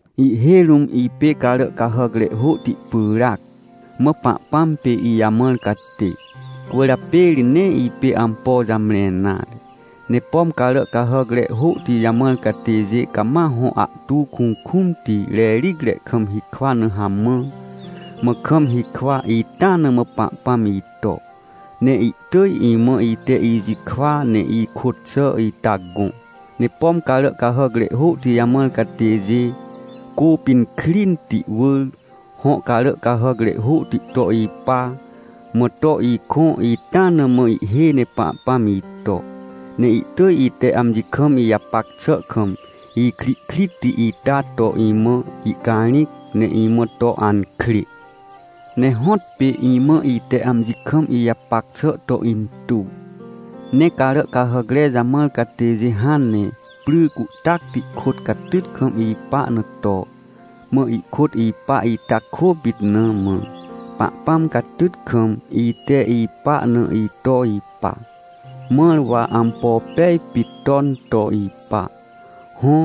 Ihhêj rũm ipê carà cahàcre hôhti pyràac, mã Pahpãm pê ijamãr catê. Cwỳrjapê ri nee ipê ampo jamre nare. Ne pom carà cahàcre hôhti jamãr catêjê cama hõ ahtu kukũmti rericre kam hikwa na hamã, mã kam hikwa, ita na mã Pahpãm ito, ne ihtỳj imã ite ijikwa ne ikôt xà ita gõ. Ne pom carà cahàcre hôhti jamãr catêjê cô pinkrinti wỳr, hõ carà cahàcre hôhti to ipa, mã to ikõ, ita na mã ihhêj ne Pahpãm ito, ne ihtỳj ite amji kam ijapac xà kam ikrihkritti ita to imã ihcarĩc, ne imã to ankrê. Ne hõtpê imã, ite amji kam ijapac xà to intuw. Ne carà cahàcre jamãr catêjê hãn ne pry cuhtacti kôt catyt kam ipa na to, mã ihkôt ipa, ita kôpit na mã, Pahpãm catyt kam ite ipa na ito ipa, mãr wa ampo pej pit ton to ipa. Hõ,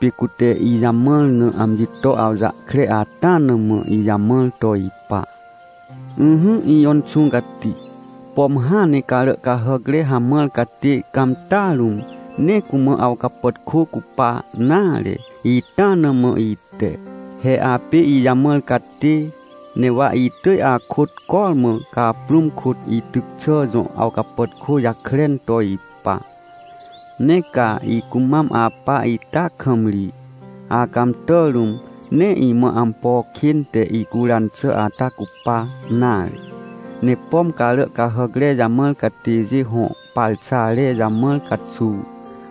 pê cute ijamãr na amji to awjahkre ata na mã ijamãr to ipa. Ỹhỹ ijõ Inxũ Cati, pom hãn ne carà cahàcre hamãr catê cãmtà rũm, nee cumã awcapàtkô cupa nare, ita na mã ite. He apê ijamãr catê, ne wa itỳj akôt cormã caprũm kôt ityc xà jõ awcapàtkô jakren to ipa. Ne ca icumam apa ita kam ri, acãmtà rũm, nee imã ampo kên te icuran xà ata cupa nare. Ne pom carà cahàcre jamãr catêjê hõ parxare jamãr caxuw,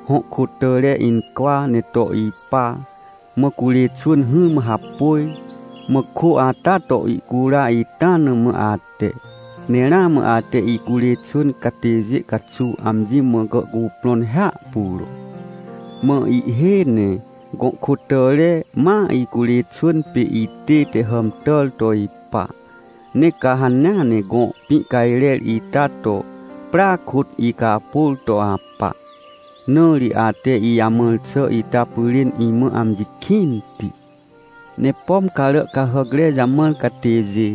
hõ kôtàre incwa ne to ipa, mã curê xwỳn hỹrmã hapôj, mã kô ata to ihcura, ita na mã ate, ne ramã ate icurê xwỳn catêjê caxuw amji mã gàhcuprõn hiahpuro. Mã ihhêj ne, gõ kôtàre ma icurê xwỳn pê itête hàmtàr to ipa. Ne ca hanea ne gõ pĩcajrer ita to, prya kôt icapôr to apa. Na ri ate ijamãr xà ita pyrên, imã amji kĩnti. Ne pom carà cahàcre jamãr catêjê,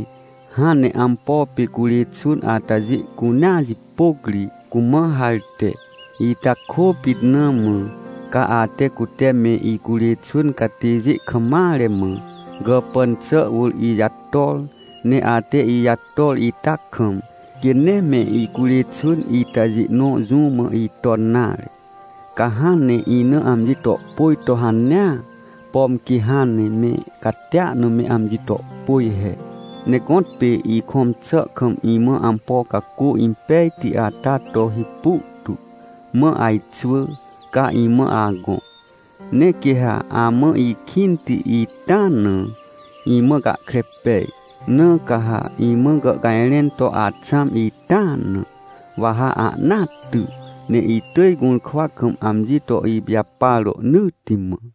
hãn ne ampo pê curê xwỳn atajê cunea jipôc ri cumã harte, ita kôpit na mã, ca ate cute me icurê xwỳn catêjê kam mare mã, gàpàn xà wỳr ijator. Ne ate ijator ita kam, quê nee me icurê xwỳn itajê nõ jũ mã iton nare. Ca hãn ne ina amji tohpôj to hanea, pom quê hãn ne me catia na me amji tohpôj he. Ne gõtpê ikõm xà kam imã ampo cacô impejti ata to hipu tu, mã ajxwỳ, ca imã agõ. Ne quê ha amã ikĩnti itaa na, imã gahkre pej. Na ca ha imã gàhcajrẽn to axãm itaa na, wa ha ahnaa ty, ne itỳj gũrkwa kam amji to ipijapar rohnỳtti mã.